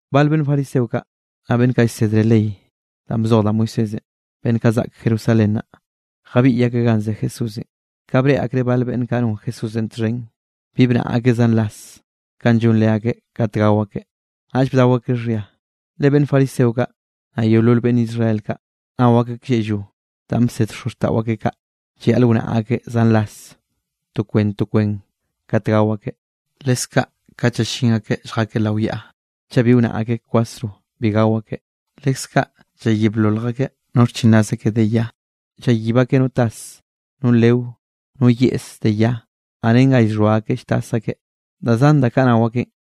Bal beꞌnn fariseo kaꞌ, naꞌ beꞌnn kaꞌ llsedre ley danꞌ bzoj da Moisésenꞌ beꞌnn kaꞌ zaꞌk Jerusalén naꞌ, jabiꞌy akeꞌ ganꞌ ze Jesúsenꞌ. Ka breꞌe akreꞌ bal beꞌnn kaꞌ non Jesúsenꞌ txhen bi bnaꞌa akeꞌ zan ras kanꞌ llon leakeꞌ kat gao akeꞌ, naꞌll bdao akeꞌ xhia. (Le beꞌnn fariseo kaꞌ, naꞌ yeolol beꞌnn Israel kaꞌ, nao akeꞌ klleꞌllo danꞌ bsed xozxtaꞌo akeꞌ kaꞌ, llayaꞌl wnaꞌa akeꞌ zan ras to kwen to kwen kat gao akeꞌ. Leskaꞌ kat llallín akeꞌ lljakeꞌ lao yaꞌa, chaꞌ bi wnaꞌa akeꞌ kwasro bi gao akeꞌ. Leskaꞌ llayiblolj akeꞌ no xchinraz akeꞌ de ya, llayib akeꞌ no tas, no leo, no yeꞌse de ya, naꞌ ren ga llxhoa akeꞌ lltas akeꞌ, da zan da kaꞌ nao akeꞌn.)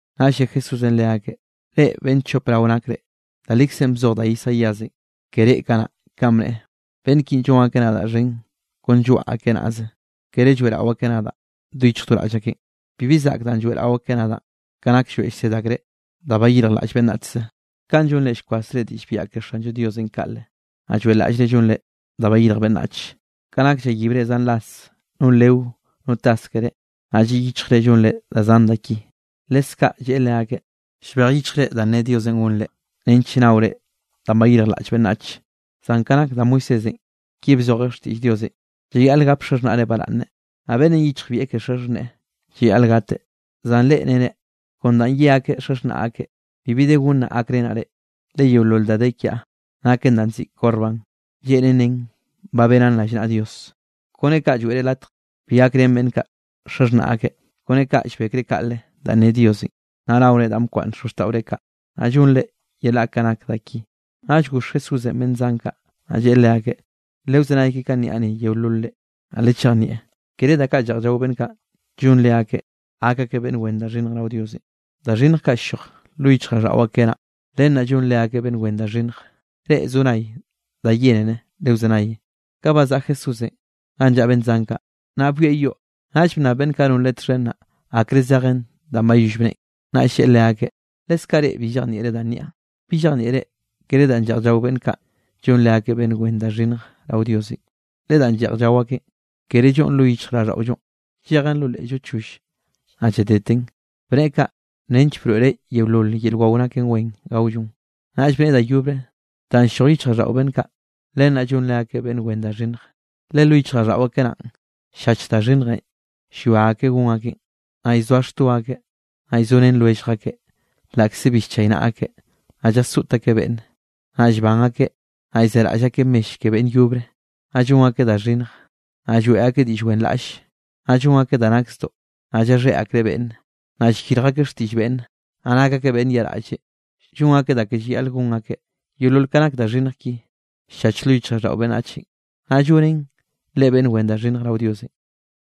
Naꞌll lle Jesúsenꞌ leakeꞌ: —¡Reꞌ beꞌnn chop rao nakre! Da likzenꞌ bzoj da Isaíasenꞌ ke reꞌ kanaꞌ, kanꞌ bneꞌe: Beꞌnn ki llon akeꞌ nadaꞌ xhen kon lloaꞌ akeꞌ nazeꞌ, kere lloeꞌrao akeꞌ nadaꞌ do yichj do raꞌll akeꞌn. Bibi zaꞌk danꞌ lloeꞌrao akeꞌ nadaꞌn, ka nak llroeꞌ llsed akreꞌ da bayirjlaꞌll beꞌnnachzenꞌ. Kaꞌn llonre llkwasre diꞌll biaꞌa ke Xanllo Diosenꞌ kaꞌle, naꞌ lloeꞌlaꞌllre llonre da bayirj beꞌnnach, ka nak llayibre zan ras no leo, no tas keré, naꞌ lliꞌ yichjre llonre da zan ka da ki. Leskaꞌ lleꞌe leakeꞌ: —Llbej yichjre danꞌ ne Diosenꞌ gonre nench nnaore danꞌ bayirjlaꞌll beꞌnnach. Zan ka nak da Moisésenꞌ, ki bzojeꞌ xtiꞌll Diosenꞌ: “Llayaꞌl gap xaxhnaꞌre baraꞌnne”, naꞌ “Beꞌnnenꞌ yichjbieꞌ ke xaxhneꞌe llayaꞌl gateꞌ.” Zan reꞌ nere: “Kon danꞌ ye akeꞌ xaxhnaꞌ akeꞌ: Bibi de gonnaꞌ gakrenaꞌ reꞌ, le yeolol da de kiaꞌ naken danꞌ nziꞌi Corbán” (lleꞌnen nen ba benaꞌn rallnaꞌa Diosenꞌ). Kone kaꞌ lloeꞌre latj bi gakrén beꞌnn kaꞌ xaxhnaꞌ akeꞌ. Kone kaꞌ llbekre kaꞌle danꞌ ne Diosenꞌ, naꞌ naore danꞌ bkwaꞌnn da xozxtaꞌore kaꞌ, naꞌ llonre yelaꞌ ka nak da ki. Naꞌll goxh Jesúsenꞌ beꞌnn zan kaꞌ, naꞌ lleꞌe leakeꞌ: —Lewzenay ke kanꞌ niaꞌ ni yeololre, naꞌ lechejnieꞌ. Kere da kaꞌ lleꞌj llao beꞌnn kaꞌ, llon leakeꞌ gak akeꞌ beꞌnn wen da xhinnj rao Diosenꞌ. Da xhinnj kaꞌ ll-lloj lo yichjraꞌlldaꞌo akeꞌ naꞌn, len naꞌ llonen leakeꞌ beꞌnn wen da xhinnj. Reꞌ zo nay da yénere, lewzenay. Ka bazaꞌa Jesúsenꞌ ganꞌ llaꞌa beꞌnn zan kaꞌ, naꞌ byoeꞌ yoꞌ, naꞌll bnnab beꞌnn kaꞌ non Leꞌe txhen naꞌ, akre zejen danꞌ bayoll bneꞌen. Naꞌll lleꞌe leakeꞌ: —¿Leskaꞌ reꞌ bi llejnieꞌre danꞌ niaꞌ? ¿Bi llejnieꞌre kere danꞌ lleꞌj llao beꞌnn kaꞌ llon leakeꞌ beꞌnn wen da xhinnj rao Diosenꞌ? Le danꞌ lleꞌj llao akeꞌn kere lloꞌn lo yichjraꞌlldaꞌollo, llejen lo leꞌllo choll, naꞌ lladeten. Bneꞌe kaꞌ, nench broeꞌreꞌ yeolol yel wao naken wen gaollon. Naꞌll bneꞌe da yobre: —Danꞌ ll-lloj yichjraꞌlldaꞌo beꞌnn kaꞌ, len naꞌ llon leakeꞌ beꞌnn wen da xhinnj. Le lo yichjraꞌlldaꞌo akeꞌ naꞌn, ll-llach da xhinnjenꞌ llwia akeꞌ gon akeꞌn, naꞌ llzoa xto akeꞌ, naꞌ llzorén lwellj akeꞌ laꞌkze bi nchaynaꞌa akeꞌ, naꞌ llasoꞌt akeꞌ beꞌnne; naꞌ llban akeꞌ, naꞌ llzeraꞌll akeꞌ mell ke beꞌnn yobre, naꞌ llon akeꞌ da xhinnj, naꞌ lloeꞌ akeꞌ diꞌll wenraꞌlle, naꞌ llon akeꞌ da nak zdoꞌ, naꞌ llaxheꞌ akreꞌ beꞌnne, naꞌ llyirj akeꞌ xtiꞌll beꞌnne, naꞌ nak akeꞌ beꞌnn yaꞌraꞌlle, llon akeꞌ da ke llayaꞌl gon akeꞌ. Yeolol ka nak da xhinnj ki, ll-llach lo yichjraꞌlldaꞌo beꞌnnachenꞌ, naꞌ llonen leꞌe beꞌnn wen da xhinnj rao Diosenꞌ.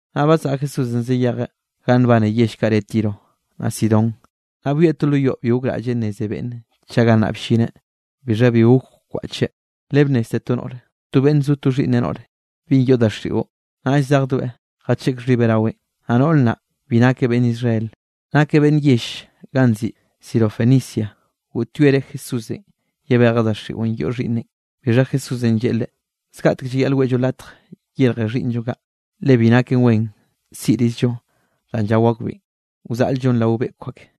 Naꞌ bazaꞌa Jesúsenꞌ zayejeꞌ ganꞌ nbane yell kaꞌ re Tiro naꞌ Sidón. Naꞌ byoeꞌ to lo yoꞌ bi gokraꞌlleꞌ nneze beꞌnne chaꞌ gannaꞌ bllineꞌ, bixha bi gok kwaꞌcheꞌ. Le bnnezte to noꞌre, to beꞌnn zo to xhiꞌnneꞌ noꞌre, binꞌ yoꞌ daxiꞌo. Naꞌll zejdoeꞌ jacheꞌk xhibeꞌ raweꞌn. Naꞌ noꞌr naꞌ, bi nakeꞌ beꞌnn Israel, nakeꞌ beꞌnn yell ganꞌ nziꞌi Sirofenicia; goꞌtyoereꞌ Jesúsenꞌ yebejeꞌ daxiꞌon yoꞌ xhiꞌnneꞌn. Bixha Jesúsenꞌ lleꞌe leꞌe: —Zgaꞌtek llayaꞌl weꞌllo latj yerje xhiꞌnnllo kaꞌ, le bi naken wen siꞌrizllo danꞌ llao akbeꞌn, wzaꞌl-llon rao beꞌkw ak.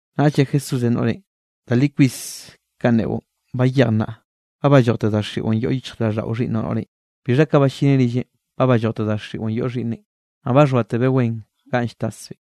Naꞌll lle Jesúsenꞌ noꞌrenꞌ: —Da li kwis kanꞌ neꞌon. Bayej naꞌ, ba ballojte daxiꞌon yoꞌ yichjraꞌlldaꞌo xhiꞌnnoꞌ noꞌrenꞌ. Bixha ka ballineꞌ rilleꞌn, ba ballojteꞌ daxiꞌon yoꞌ xhiꞌnneꞌn, naꞌ ba xhoatebeꞌ wen ganꞌ lltasbeꞌn.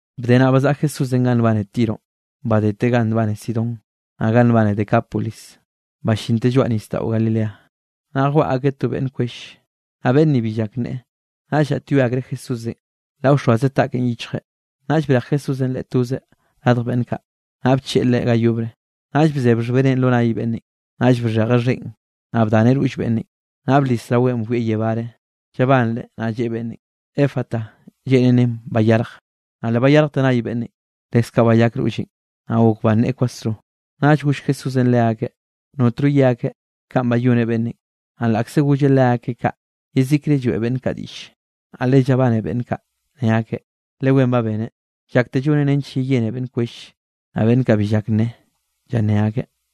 Bde naꞌ bazaꞌa Jesúsenꞌ ganꞌ nbane Tironꞌ, badeteꞌ ganꞌ nbane Sidón, naꞌ ganꞌ nbane Decápolis ballinteꞌ lloaꞌ nisdaꞌo Galilea. Naꞌ jwaꞌa akeꞌ to beꞌnn kwell, naꞌ beꞌnn ni bi llak nneꞌe, naꞌll llaꞌtyoe akreꞌ Jesúsenꞌ laꞌ wxoaze taꞌkeꞌn yichjeꞌ. Naꞌll brej Jesúsenꞌ leꞌe tozeꞌ radj beꞌnn kaꞌ, naꞌ bcheꞌe leꞌe ga yobre, naꞌll bzeb xhbeneꞌ lo nay beꞌnnenꞌ, naꞌll bxhejeꞌ xheꞌn, naꞌ bdaneꞌ roll beꞌnnenꞌ. Naꞌll blis raweꞌn llwieꞌ yebáre, llabanreꞌ, naꞌ lleꞌe beꞌnnenꞌ: —¡Efata! —Lleꞌnen nen: ¡Bayarje! Naꞌ le bayarjte nay beꞌnnenꞌ, leskaꞌ bayak rolleꞌn, naꞌ gok banneꞌe kwasro. Naꞌll goll Jesúsenꞌ leakeꞌ notno ye akeꞌ kanꞌ bayoneꞌ beꞌnnenꞌ. Naꞌ laꞌkze golleꞌ leakeꞌ kaꞌ, yezikre lloeꞌ beꞌnn kaꞌ diꞌlle. Naꞌ le llabane beꞌnn kaꞌ, ne akeꞌ: —Le wen ba beneꞌ, llakteꞌ lloneꞌ nench yeyene beꞌnn kwell, naꞌ beꞌnn kaꞌ bi llak nneꞌe, llanné akeꞌ.